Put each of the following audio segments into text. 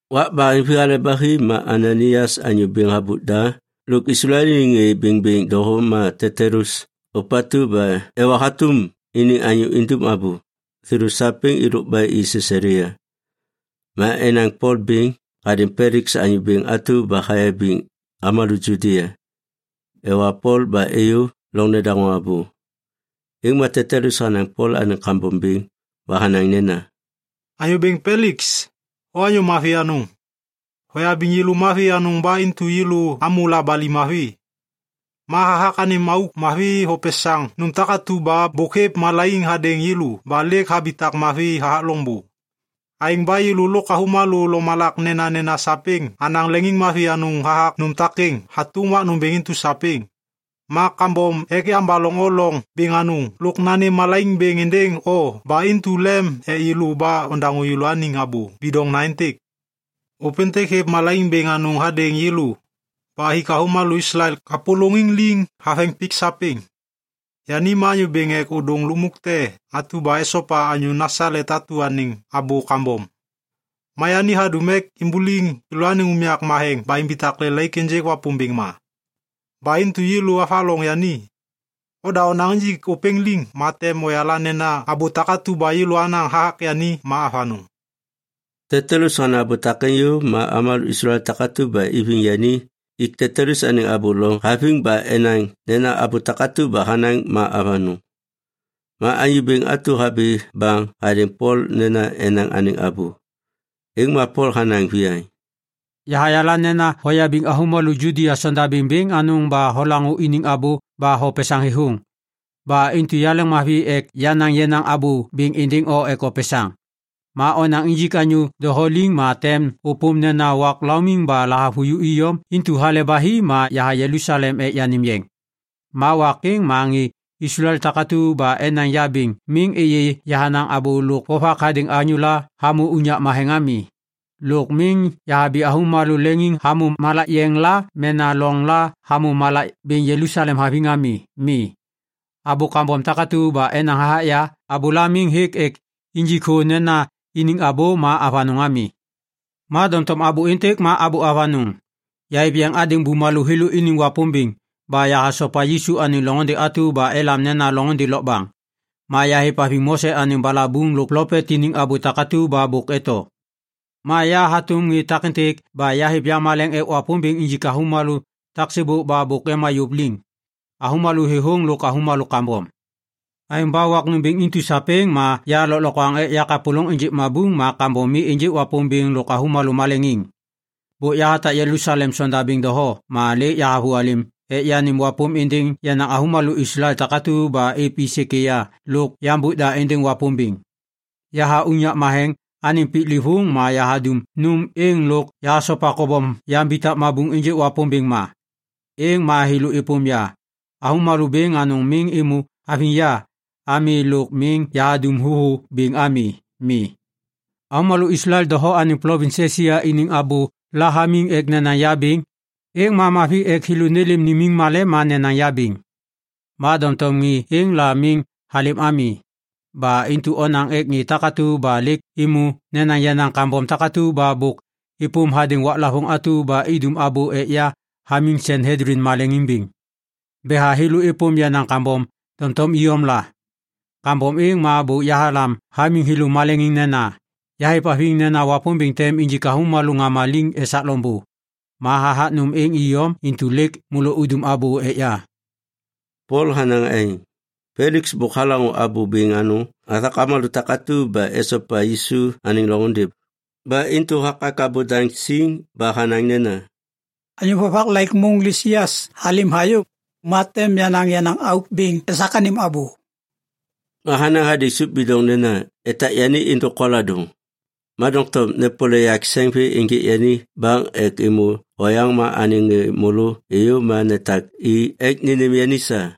Wak baheŋvi hale ba hi, ma Ananaias anyô bêŋ habôk da lôk Islael iniŋ ŋê bêŋbêŋ doho ma Tetulus ôpatu ba ewa hatôm iniŋ anyô indum abô, thêlô sapêŋ êlôk ba i Sisalia. Ma enaŋ Pol bêŋ hadêŋ Peliks anyô bêŋ atu ba hayabiŋ avômalô Judia. Ewa Pol ba êyô loŋ nedaŋô abô. Êŋ ma Tetulus hanaŋ Pol anêŋ kambom bêŋ ba hanaŋ nena, “Anyô bêŋ Peliks, o anyô mavi anôŋ. Hoyabiŋ yêlô mavi anôŋ ba intu yêlô amô labali mavi. Ma hathak anêm auk mavi hopesaŋ nôm takatu ba bôk hêv malaiŋ hadêŋ yêlô ba lêk habitak mavi hathak loŋbô. Aêŋ ba yêlô lôk avômalô lomalak nenanena sapêŋ anaŋ leŋiŋmavi anôŋ hathak nôm takêŋ hatôm wak nômbêŋ intu sapêŋ. Ma kambom ek yambaloŋ o loŋ bêŋ anôŋ lôk nanêm malaiŋ êndêŋ o ba intu lem ek yêlô ba ondaŋô yêlôaniŋ abô bidoŋna êntêk. “Ôpêntêk hêv malaiŋ bêŋ anôŋ hadêŋ yêlô ba hik avômalô Islael kapôlôŋiŋ liŋ haveŋ pik sapêŋ. Yani ma anyô bêŋ ek ôdôŋ lukmuk te atu ba esopa anyô Nasalet atu anêŋ abô kambom. Ma yani hadum ek imbuliŋ yêlôaniŋ unyak matheŋ ba imbitak lelaik ênjêk Wapômbêŋ ma. Ba intu yêlô avaloŋ yani. Oda onaŋ injik ôpêŋ liŋ ma tem oyala nena abô takatu ba yêlô anaŋ hathak yani ma avanôŋ.” Tetulus hanaŋ abô takêŋ yôv ma avômalô Islael takatu ba iviŋ yani ik Tetulus anêŋ abô loŋ haviŋ ba enaŋ nena abô takatu ba hanaŋ ma avanôŋ. Ma anyô bêŋ atu habi baŋ hadêŋ Pol nena enaŋ anêŋ abô. Êŋ ma Pol hanaŋ viyaŋ, “Yahayala nena hoyabiŋ avômalô Judia sondabêŋ bêŋ anôŋ ba holaŋô iniŋ abô ba hopesaŋ thêthôŋ. Ba intu yaleŋmavi ek yanaŋ yenaŋ abô bêŋ êndêŋ o ek opesaŋ. Ma onaŋ injik anyô doho liŋ ma tem ôpôm nena wak laumiŋ ba lahavuju iyom intu hale ba hi ma yaha Jelusalem ek yanêm yeŋ. Ma wak êŋ ma ŋê Islael takatu ba enaŋ ya bêŋ miŋ êyê yahanaŋ abô lôk vovak hadêŋ anyôla hamô unyak matheŋ ami, lôk miŋ yahabi avômalô leŋiŋ hamô malak yeŋ la mena loŋ la hamô malak bêŋ Jelusalem haviŋ ami. Mi. Abô kambom takatu ba enaŋ hathak ya, abôla miŋ hêk ek injik thô nena iniŋ abô ma avanôŋ ami. Ma doŋtom abô êntêk ma abô avanôŋ: Yahêv yeŋ hadêŋ bumalô thêlô iniŋ Wapômbêŋ ba yahasopa Yisu anêŋ loŋôndê atu ba elam nena loŋôndê lokbaŋ. Ma yahêvhaviŋ Mose anêŋ balabuŋ lôk plopet iniŋ abô takatu ba bôk eto. Ma ya hatôm ŋê takêntêk ba yahêv yamaleŋ ek Wapômbêŋ injik avômalô taksêbôk ba bôk ema yôv liŋ, avômalô thêthôŋ lôk avômalô kambom. Aêŋ ba wak nômbêŋ intu sapêŋ ma ya lôklokwaŋ ek yakapôlôŋ ênjêk mabuŋ ma kambom mi ênjêk Wapômbêŋ lo avômalô maleŋiŋ. “Bôk yahatak Jelusalem sondabêŋ doho ma lêk yahavôhalêm ek yanêm wapôm êndêŋ yenaŋ avômalô Islael takatu ba êv i sêkêya lôk yambôk da êndêŋ Wapômbêŋ. Yaha unyak matheŋ anêŋ piklêvôŋ ma yahadum nôm êŋ lôk yahasopa kobom yambitak mabuŋ ênjêk Wapômbêŋ ma. Êŋ ma thêlô êpôm ya. Avômalô bêŋ anôŋ miŋ êmô haviŋ ya ami lôk miŋ yahadum thôthô bêŋ ami. Mi. Avômalô Islael doho anêŋ plovins Esia iniŋ abôla hamiŋ ek nenaŋ ya bêŋ, êŋ ma mavi ek thêlô nêlêm nimiŋ malem ma nenaŋ ya bêŋ. Ma doŋtom ŋê êŋ la miŋ halêm ami. Ba intu onaŋ ek ŋê takatu ba lêk êmô nenaŋ yenaŋ kambom takatu ba bôk êpôm hadêŋ waklavôŋ atu ba idum abô ek ya hamiŋ Sanhedlin maleŋiŋ bêŋ. Betha thêlô êpôm yenaŋ kambom doŋtom iyom la. Kambom êŋ ma bôk yahalam hamiŋ thêlô maleŋiŋ nena, ‘Yahêvhaviŋ nena Wapômbêŋ tem injik avômalô ŋama liŋ esak loŋbô. Ma hathak nôm êŋ iyom intu lêk môlô udum abô ek ya.’” Pol hanaŋ aêŋ. Peliks bôk halaŋô abô bêŋ anôŋ hathak avômalô takatu ba esopa Yisu anêŋ loŋôndê. Ba intu hakak abô daŋ siŋ ba hanaŋ nena, “Anyô vovak laik môŋ Lisias halêm hayô ma tem yanaŋ yenaŋ auk bêŋ esak anêm abô.” Ma hanaŋ hadêŋ sôp bidoŋ nena etak yani êndôk koladôŋ, ma doŋtom nepole yak sêŋ vê ênjêk yani baŋ ek êmô oyaŋ ma anêŋ ŋê môlô êyô ma netak i ek nênêm yani sa.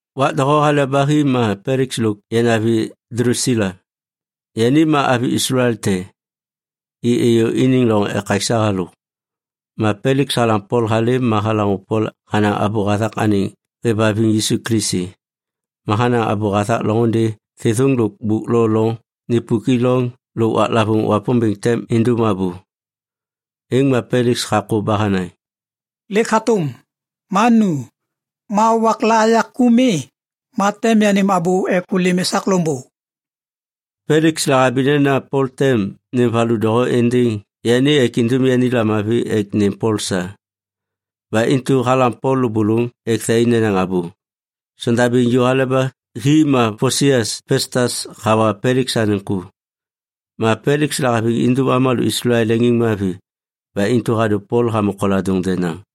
Wak doho hale ba hi ma Peliks lôk yanavi Dlusila, yani ma avi Islael te, i êyô iniŋ loŋ ekaksa halôk. Ma Peliks halam Pol halêm ma halaŋô Pol hanaŋ abô hathak anêŋ hêvhaviŋ Yisu Kilisi. Ma hanaŋ abô hathak loŋôndê thêthôŋ lôk bôk lo loŋ nipuk i loŋ lôk waklavôŋ Wapômbêŋ tem indum abô, êŋ ma Peliks hakô ba hanaŋ, “Lêk hatôm, ma nu. Ma wakla ya ku mi, ma tem yanêm abô ek ôlêm esak loŋbô.” Peliks lahabi nena Pol tem nêm valu doho êndêŋ yani ek indum yani lamavi ek nêm Pol sa. Ba intu halam Pol lôbôlôŋ ek thai nenaŋ abô. Sondabêŋ ju hale ba hi ma Posias Pestas hawa Peliks anêŋ ku. Ma Peliks lahaviŋ indum avômalô Islael leŋiŋmavi ba intu hadô Pol hamô koladôŋ denaŋ.